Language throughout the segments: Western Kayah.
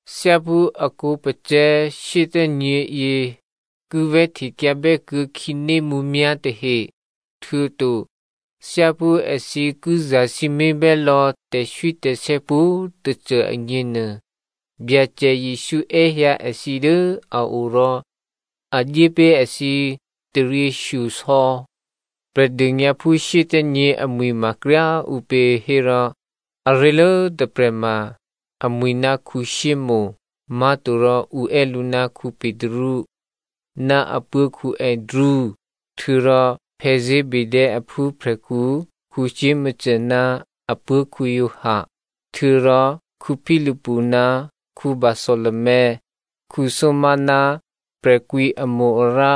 Thyáphú a khǒpacè̤̌ shyéthè́nyě̤yě ki vè̤́htekyǎbè́ kuô̌ khǐné mǔmyá̤ tahe, htuô̌to thyáphú èthǐ ki zasǐmé̤bè́ lò̌ tè̤swítè̤sè̌ pwǒ̤꤮ tôcô agněnuô, Byacè Jesǔ è́hyǎ èthǐ dố a o rò a dyé pé̤ èthǐ taryěshyosò̌. Prè̤dônyǎphú shyéthè́nyě̤ amwi̤ ma kryá꤮ ǔpě hérò, aré̤lố tôprè̤ ma amwi̤ ná Simonè má̤torò ǔ è́ lǔ ná Petru ná apuố̤ Andrea, htuô̌rò Zebedeo aphúprè̤khǔ Jakomo ná apuố̤ Giovanni, htuô̌rò Philipu ná Bartholomeo, Thomazo ná prè̤kwǐamo-arǎ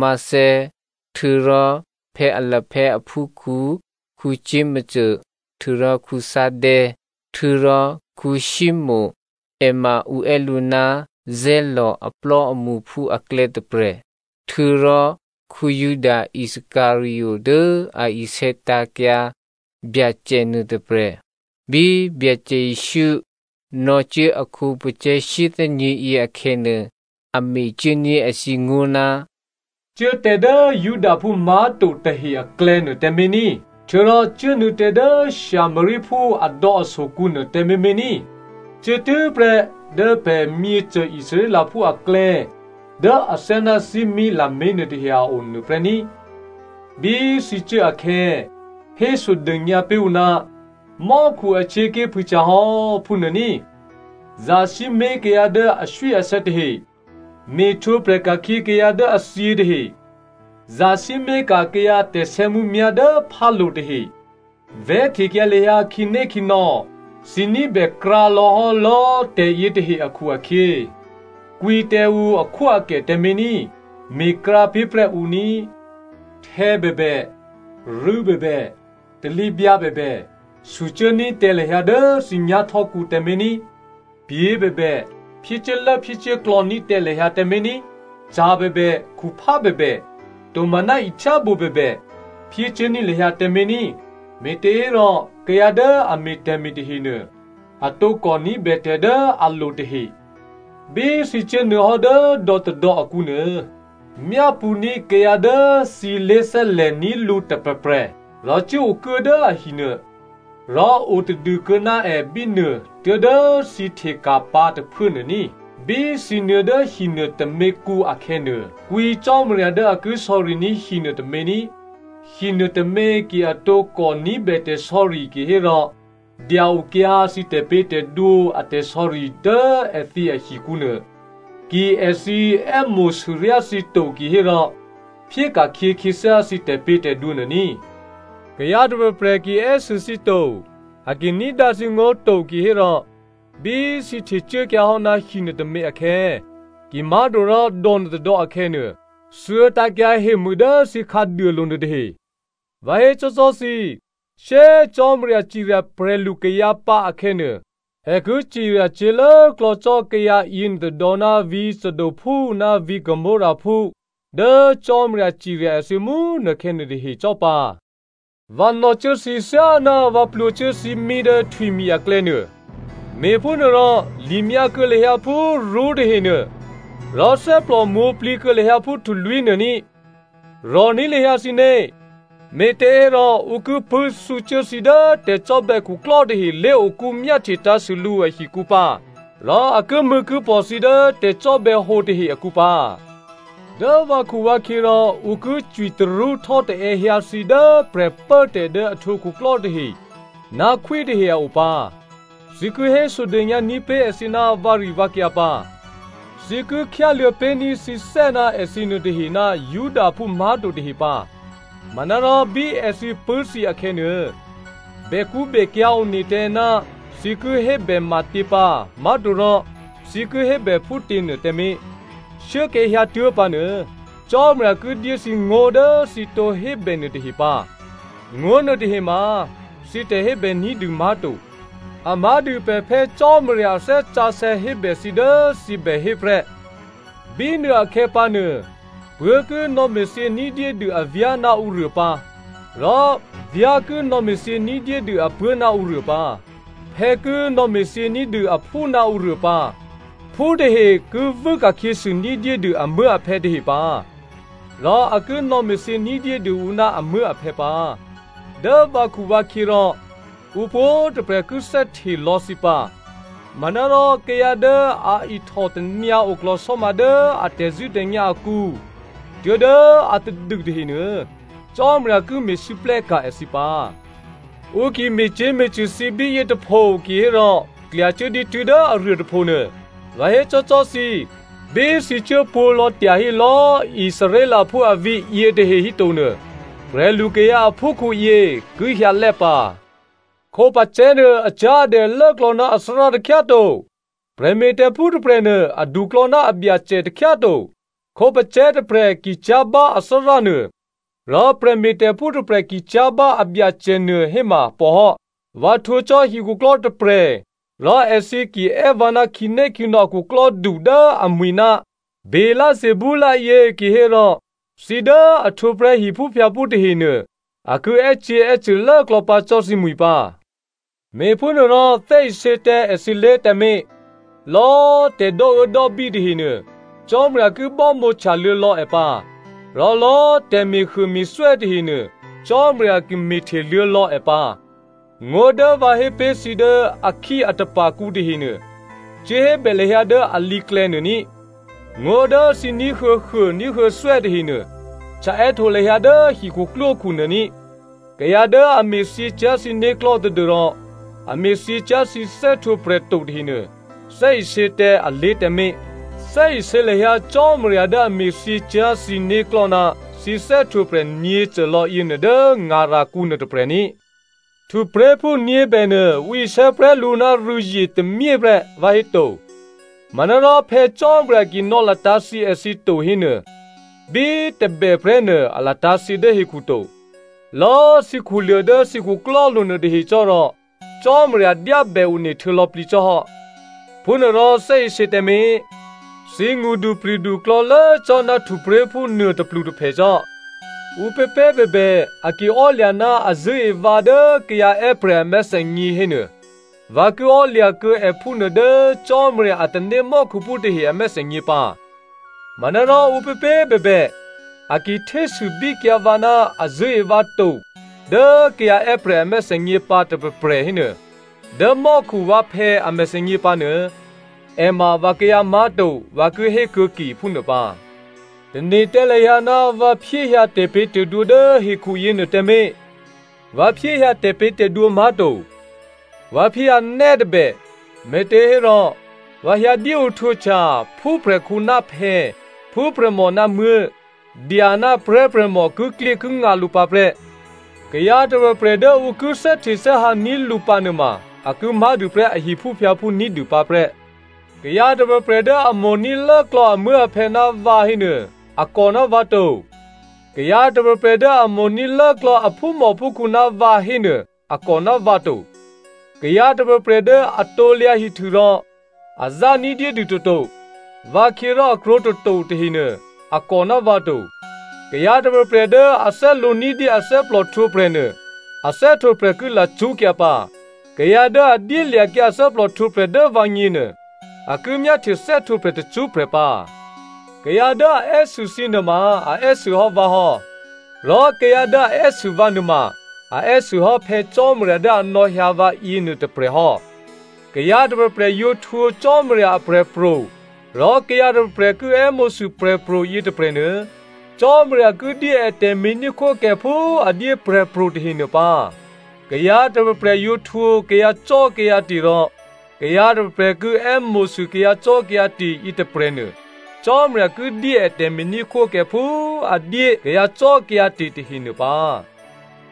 Matteo, htuô̌rò Alphaeo aphúkhǔ Jakomo htuô̌rò Thaddeo, htuô̌rò Simonè, è ma ǔ è́ lǔ ná Zeloto aplò́amṳphú aklè̌ tôprè̤, htuô̌rò Juda Iscariot dố a isè̌tǎ̤kyǎ Byacè nuôtôprè̤. Bí Byacè Jesǔ nò̌cuố a khǒpacè̤̌ shyéthè́nyě̤ yě akhè̌nuô, a mecuốní̤ èthǐ ngó̤, “Cuố tǎ dố Judaphú má̤to tahe aklè̌nuô tǎmé̤ ní, htuô̌rò cuốnuô̌ tǎ dố Samariaphú adò̌asokǔ nuô tǎmé̤mé̤ ní꤮. Cuốtû́prè́ dố pè̤ myěcô Israelphú aklè̌ dố athyáná thímí lamé̤ nuôtahe a o nuôprè́ ní꤮. Bí thǐ cuố akhè̌, hésodônyǎ pé̤ ǔ, ‘Mò́khu ahtyěaké̤ phûhtyahò́,’ phúnuô ní꤮. Zasǐmé̤ kayǎ dố aswíasè̌ tahe, me̤htwǒprè̤ ka̤khyě kayǎ dố a thyě tahe, zasǐmé̤ka̤ kayǎ tè̤sè̌mǔmyá̤ dố phálo̤ tahe, vè̤́htekyǎ lahyǎ khǐnékhǐnò̌, thǐ ní̤bè krǎ lò̌hò́ lò̌꤮ tè̤yě tahe akhu-akhyě kwǐ tǎ ǔ akhwóakè tǎmé̤ ní, me̤krǎ pé̤prè́ ǔ ní꤮. Htè̌bèbè, rû̌bèbè, talǐbyǎ bèbè sucuố ní̤ tǎ lahyǎ dố thǐ nyá̤htò́kǔ tǎmé̤ ní꤮. Pyě̤ bèbè, phyécuốlốphyécuốklò̌ ní̤tǎ lahyǎ tǎmé̤ ní, ca̤ bèbè, khuphá bèbè, tomaná ihtyábǒ bèbè phyécuốní̤ lahyǎ tǎmé̤ ní꤮. Me̤těhérò kayǎ dố a me̤ tè̤me̤ tahenuô a tǒkò ní̤bè tè̤ dố a lo tahe. “Bí thǐ cuốnuô̌hò́ dố dò̌tôdò̌ akǔnuô, myápṳ̌ ní̤ kayǎ dố thǐ lé̤thè́lè̤ní̤ lǔ tôprè̤prè̤ rò cuốokuố dố ahi nuô. Rò otadû kuô̌ná è bínuô tuố̤dố thǐ hteka̤pǎ tôphuố nuô ní꤮. Bí thǐ nuô̌ dố hinuô tôměkǔ akhè̌nuô, kwǐ Cò́marya dố a ki sò̌riní̤ hinuô tômě ní꤮. Hinuô tômě ki a tǒkò ní̤bè tè̤sò̌ri kihérò dya-okyǎ thǐ tè̤pě̤tè̤dwǒ a tè̤sò̌ri dố èthǐ ahikǔ nuô. Ki èthǐ è́mo̤sûryá thǐ to kihérò phyéka̤khyě khyěthyá thǐ tè̤pě̤tè̤dwǒ nuô ní꤮. Kayǎ tôprè̤prè̤ ki è́sû thǐ to, a ki ní̤dǎ thǐngó̤ to kihérò, bí thǐ htecuốkyǎ hò́ ná hi nuôtômě akhè̌, kimá̤torò dò̌ nuôtôdò̌ akhè̌nuô, thuô̌tǎ̤kyǎ hemû dố thǐ khǎduôlo̤ nuôtahe. Vǎ hécò́cò́ thǐ, shyé꤮ Cò́marya cirya prè̤lukayǎ pǎ akhè̌nuô, è ki cirya cyě̤lốklò̌ cò́ kayǎ yěnuôtôdò̌ ná vǐ̤ Sodomphú ná vǐ̤ Gomorraphú dố Cò́marya cirya èthǐ mú꤮ nukhè̌ nuôtahe cò́pǎ. “Vǎ nò̌cuố thǐ thyáná vǎ plwǒcuố thímí dố htwimi̤ aklè̌ nuô. Me̤phúnuôrò limyǎ kuô̌ lahyǎ phú rṳ́tahenuô, rò thè́plò mwǒ̤plǐ kuô̌ lahyǎ phú htulwí̤ nuô ní꤮. Rò̤ní̤ lahyǎ thǐné̤, me̤těhérò ǔ ki pṳ̂́ thǔcuố thǐ dố tè̤cò́bè̌ khuklò́ tahe lé̤okú myáhtye tǎ̤sû lǔ ahikǔ pǎ rò a kimṳ̂̌kipò̤ thǐ dố tè̤cò́bè̌hǒ tahe akǔ pǎ. Dố vǎkhuvǎkhyě rò ǔ ki cwitarṳ́htò́taè̌ hyǎ thǐ dố prè̤pốtè̤ dố a htwǒ khuklò́ tahe ná khwítahe a o pǎ. Thǐ ki hésodônyǎ ní̤pé̤ èthǐ ná vǎrivǎkyǎ pǎ. Thǐ ki khyáluô̌ pé̤ní̤ thǐthè́ ná èthǐ nuôtahe ná Judaphú má̤to tahe pǎ. Manárò bí èthǐ pṳ̂́ thǐ akhè̌nuô, bèkṳ́bèkyǎ̤ one tǎ ná thǐ ki hébè matě pǎ má̤torò thǐ ki hébè phútěnuô tǎmé̤. Shuốkhè̌ hyǎtuố̤ pǎnuô, Cò́marya ki dyé thǐ ngó̤ dố thǐ tǒ hébè nuôtahe pǎ. Ngó̤ nuôtahe ma thǐ tè̤hébè ní̤dû má̤to, a má̤dû pè̤ Phè̌ Cò́marya a Thè́ Sǎsè̌ hébè thǐ dố thǐ bèhé prè́. “Bínuôakhè̌ pǎnuô, puố̤ ki nò̌me̤thyě ní̤dyédû avyá̤ ná ǔruô pǎ, rò vyá̤ ki nò̌me̤thyě ní̤dyédû apuố̤ ná ǔruô pǎ, phè̌ ki nò̌me̤thyě ní̤dû aphú ná ǔruô pǎ, phú tahe ki vû́ ka̤khyěsû ní̤dyédû amuố̤aphè̌ tahe pǎ, rò a ki nò̌me̤thyě ní̤dyédû ǔ ná amuố̤aphè̌ pǎ. Dố vǎkhuvǎkhyě rò, ǔ pwǒ̤꤮ tôprè̤ ki thè́hte lò̌ thǐ pǎ. Manárò kayǎ dố a ihtòtanyǎ oklò̤sò́ma dố a tè̤zṳ̂́tè̤nyá̤ akǔ tuố̤dố atadû tahenuô Cò́marya ki me̤lwóhteka̤ èthǐ pǎ.” Ǔ ki me̤cyě̤me̤cṳ̂ thǐ bíyě tôpho kihérò klyacuố dǐtû́ dố aruô tôpho nuô. Vǎ hécò́cò́ thǐ, bí thǐ cuố pwǒ̤lò̌ tyahí lò̌꤮ Israelphú avǐ̤ yětahe hítonuô, prè̤lukayǎ aphúkhǔyě ki hyǎlè́ pǎ. “Khǒpacè̤̌nuô acyá̤adè lốklò̌ ná athárá takhyá꤮ to. Prè̤me̤tè̤phú tôprè̤nuô, aduklò̌ ná abyacè takhyá꤮ to. Khǒpacè̤̌ tôprè̤ ki cyá̤ bá athárá nuô, rò prè̤me̤tè̤phú tôprè̤ ki cyá̤ bá abyacè nuô héma pòhò́. Vǎ htwǒ cò́ hikhuklò́ tôprè̤ rò èthǐ ki è́ vǎ ná khǐnékhǐnò̌ a khuklò́du dố amwi̤ ná Beelzebul yě kihérò thǐ dố a htwǒ prè́ hiphúphyǎphú tahenuô a ki è́cyě̤è́cṳ̂ lốklò̌ pǎ cò́ thǐmwi̤ pǎ. “Me̤phúnuôrò thè́isě tǎ èthǐlé̤ tǎmé̤. Lò̌꤮ tè̤ dò́uốdò́bí tahenuô, Cò́marya ki bámǒhtya luô̌lò̌ è pǎ, rò lò̌꤮ tè̤me̤huôme̤thwè́ tahenuô, Cò́marya ki me̤hteluô̌lò̌ è pǎ. Ngó̤ dố vǎ hé pé̤ thǐ dố akhíatapa̤kǔ tahenuô, cuốhébè lahyǎ dố alǐklè̌ nuô ní꤮. Ngó̤ dố thǐ ní̤huô̌huô ní̤huô̌thwè́ tahenuô, htya è́htǒ lahyǎ dố hikhuklwókhu nuô ní꤮. Kayǎ dố a me̤thyě cyá̤ thǐ né̤klò̤́ tadû́rò a me̤thyě cyá̤ thǐ thè́htwǒprè̤ to tahenuô, thè́isě tǎ alé̤ tǎmé̤. Thè́isě lahyǎ Cò́marya dố a me̤thyě cyá̤ thǐ né̤klò̤́ ná thǐ thè́htwǒprè̤ nyě̤côlò̌ yěnuô dố ngarakǔ nuôtôprè̤ ní꤮. Htupré̤phú nyě̤bènuô ǔ isè̌ prè́ lǔ ná rû̌zye tômyé prè́, vǎhéto? Manárò Phè̌ Cò́marya ki nò̌latǎ̤ thyě èthǐ to hénuô, bí tôbè prè́nuô a latǎ̤thyě dố hekhuto. Lò̌꤮ thǐ khuluô̤ dố thǐ khuklò́lo̤ nuôtahe cò́rò, Cò́marya dyábè one htuô̌lò̌plǐ cò́hò́. Phúnuôrò thè́isě tǎmé̤! Thǐ ngṳdupri̤du klò̌lố cò́ ná htupré̤phú nuô tôplutôphè cò́. “Ǔpěpě꤮ bèbè a ki ò́lya̤ ná a zṳ̂́e vǎ dố kayǎ è́prè̤ a mèthènyě hénuô, vǎ ki ò́lya̤kuô̌ è phúnuô dố Cò́marya a tanémò́khuphú tahe a mèthènyě pǎ. Manárò ǔpěpě꤮ bèbè a ki htésûbíkyǎ vǎ ná a zṳ̂́e vǎ to dố kayǎ è́prè̤ a mèthènyě pǎ tôprè̤prè̤ hénuô, dố mò́khu vǎphè̌ a mèthènyě pǎnuô, è ma vǎkayǎ má̤to vǎ ki hé kuô̌ke phúnuô pǎ. “Tane̤ tǎ lahyǎ ná vǎ phyéhyǎ tè̤pě̤tè̤dwǒ dố hekhu yěnuô tǎmé̤. Vǎ phyéhyǎ tè̤pě̤tè̤dwǒ má̤to. Vǎ phyéhyǎ nè́ tôbè. Me̤těhérò, vǎ hyǎ dyéohtwǒhtya ‘Phúprè̤khǔ ná phè̌, phúprè̤mò ná muố̤, dya ná prè̤́prè̤mò kiklyékingǎ lǔ pǎ prè́. Kayǎ tôprè̤prè̤ dố ǔ ki thè́htethè́hǎ ní̤ lǔ pǎ nuôma a ki má̤dûprè́ a hiphúphyǎphú ní̤dû pǎ prè́.’ “Kayǎ tôprè̤prè̤ dố a mo̤ní̤ lốklò̌ amuố̤aphè̌ ná vǎ hénuô, a kò ná vǎ to. Kayǎ tôprè̤prè̤ dố a mo̤ní̤ lốklò̌ a phúmòphúkhǔ ná vǎ hénuô, a kò ná vǎ to. Kayǎ tôprè̤prè̤ dố a krusu rò a zá ní̤dyédû toto, vǎkhyě rò a krwǒ toto tahenuô, a kò ná vǎ to. Kayǎ tôprè̤prè̤ dố a thè́lǒ ní̤dyé athè́plò htwǒprè̤ nuô, a thè́htwǒprè̤ ki lacṳ́kyǎ pǎ. Kayǎ dố a dyélya̤kyǎ athè́plò htwǒprè̤ dố vǎgněnuô, a ki myáhtye thè́htwǒprè̤ tacṳ́prè̤ pǎ. “Kayǎ dố a è́sû thǐ nuôma a è́sûhò́ vǎ hò́. Rò kayǎ dố a è́sû vǎ nuôma, a è́sûhò́ Phè̌ Cò́marya dố a nò̌hyǎ vǎ yěnuô tôprè̤ hò́. Kayǎ tôprè̤prè̤ yǒ htwǒ Cò́marya aprè̤pro̤ rò kayǎ tôprè̤prè̤ ki è́mo̤sû prè̤pro̤ yětôprè̤nuô, Cò́marya ki dyé è tè̤me̤ní̤khwókè phú a dyé prè̤pro̤ tahenuô pǎ. Kayǎ tôprè̤prè̤ yǒ htwǒ kayǎcò́kayǎte̤ rò kayǎ tôprè̤prè̤ ki è́mo̤sû kayǎcò́kayǎte̤ yětôprè̤nuô, Cò́marya ki dyé è tè̤me̤ní̤khwókè phú a dyé kayǎcò́kayǎte̤ tahenuô pǎ.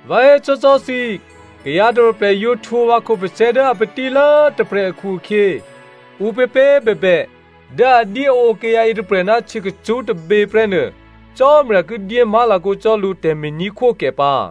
Vǎ hécò́cò́ thǐ, kayǎ tôprè̤prè̤ yǒ htwǒ vǎ khǒpacè̤̌ dố a patílố tôprè̤ akhu-akhyě, ǔpěpě꤮ bèbè dố a dyéǒ kayǎ yětôprè̤ ná htyěkacṳ́ tôbě prè́ nuô, Cò́marya ki dyé má̤lakǒ cò́ lǔ tè̤me̤ní̤khwókè pǎ.”